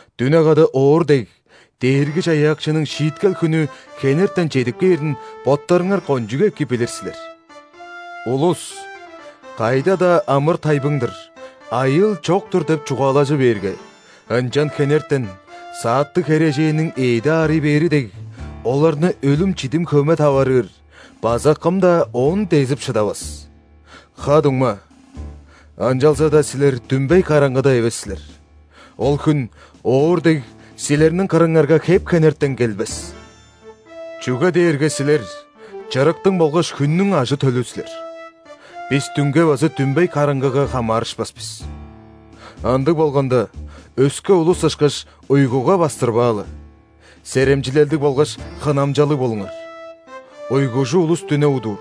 Дүне када оор дег, Дээрги-Чаяакчының шииткел хүнү хенертен чедип кээрин боттарыңар кончуг эки билир силер. Улус: «Кайда-даа амыр-тайбың-дыр, айыыл чок-тур» – деп чугаалажы бээрге, ынчан хенертен, сааттыг херээженниң эъди аарый бээри дег, оларны өлүм-чидим хөме таварыыр база кым-даа оон дезип шыдавас! Ха-дуңма, ынчалза-даа силер дүмбей караңгыда эвес силер, ол хүн, оор дег, силерниң кырыңарга хеп-хенертен келбес. Чүге дээрге силер – чырыктың болгаш хүннүң ажы-төлү силер. Бис дүнге база дүмбей караңгыга хамаарышпас бис. Ындыг болганда, өске улус ышкаш, уйгуга бастырбаалы. Серемчилелдиг болгаш хынамчалыг болуңар. Уйгужу улус дүне удуур,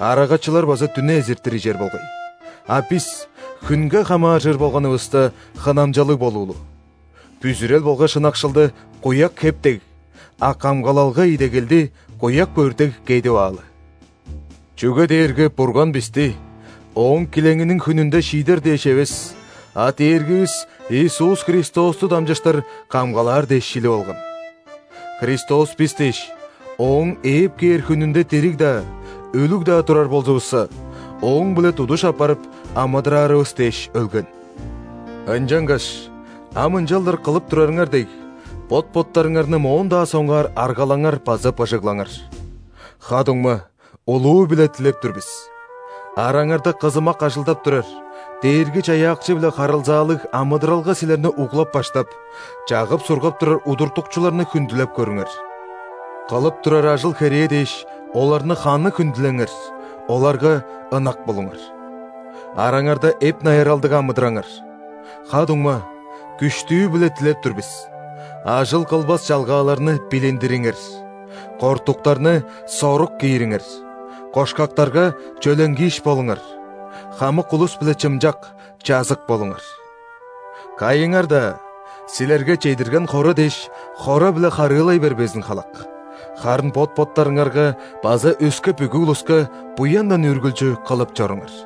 арагачылар база дүне эзиртир ижер болгай. А бис, хүнге хамааржыр болганывыста, хынамчалыг болуулу, бүзүрел болгаш ынакшылды – куяк хеп дег, а камгалалга идегелди – куяк бөрт дег кедип аалы. Чүге дээрге Бурган бисти, Ооң килеңиниң хүнүнде шиидер дээш эвес, а Дээргивис Иисус Христосту дамчыштыр камгалаар дээш шилип алган. Христос бис дээш, Ооң ээп кээр хүнүнде дириг-даа, өлүг-даа турар болзувусса, Ооң-биле тудуш апарып, амыдыраарывыс дээш өлген. Ынчангаш ам ынчалдыр кылып турарыңар дег, бот-боттарыңарны моон-даа соңгаар аргалаңар база быжыглаңар. Ха-дуңма, улуу-биле дилеп тур бис: араңарда кызымак ажылдап турар, Дээрги-Чаяакчы-биле харылзаалыг амыдыралга силерни углап-баштап, чагып-сургап турар удуртукчуларны хүндүлеп көрүңер. Кылып турар ажыл-херээ дээш, оларны ханы хүндүлеңер, оларга ынак болуңар. Араңарда эп-найыралдыг амыдыраңар. Ха-дуңма, күштүү-биле дилеп тур бис: ажыл кылбас чалгааларны билиндириңер, кортуктарны сорук киириңер, кошкактарга чөленгииш болуңар, хамык улус-биле чымчак, чазык болуңар. Кайыңар-даа силерге чедирген хора дээш хора-биле харыылай бербезин халак, харын бот-боттарыңарга база өске бүгү улуска буяндан үргүлчү кылып чоруңар.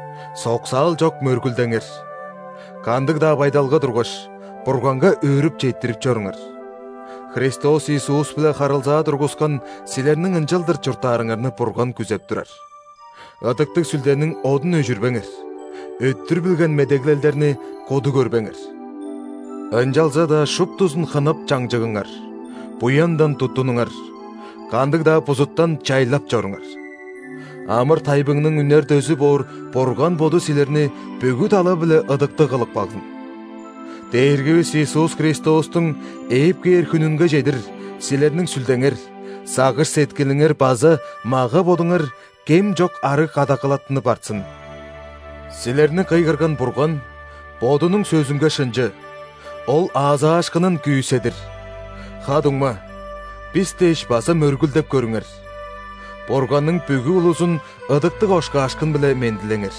Соксаал чок мөргүлдеңер. Кандыг-даа байдалга тургаш, Бурганга өөрүп четтирип чоруңар – Христос Иисус-биле харылзаа тургускан силерниң ынчалдыр чурттаарыңарны Бурган күзеп турар. Ыдыктыг Сүлдениң одун өжүрбеңер: өттүр билген медеглелдерни куду көрбеңер, ынчалза-даа шуптузун хынап чаңчыгыңар; буяндан туттунуңар, кандыг-даа бузуттан чайлап чоруңар. Амыр-тайбыңның үнер дөзү боор Бурган Боду силерни бүгү тала-биле ыдыктыг кылып кагзын. Дээргивис Иисус Христостуң ээп кээр хүнүнге чедир силерниң сүлдеңер, сагыш-сеткилиңер база мага-бодуңар кем чок арыг кадагалаттынып артсын. Силерни кыйгырган Бурган Бодунуң сөзүнге шынчы, Ол аазаашкынын күүседир! Ха-дуңма, бис дээш база мөргүлдеп көрүңер. Бурганның бүгү улузун ыдыктыг ошкаашкын-биле мендилеңер.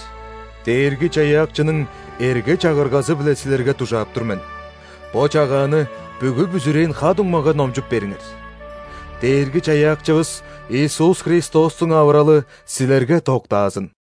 Дээрги-Чаяакчының эрге-чагыргазы-биле силерге дужаап тур мен: бо чагааны бүгү бүзүрээн ха-дуңмага номчуп бериңер. Дээрги-Чаяакчывыс Иисус Христостуң авыралы силерге доктаазын!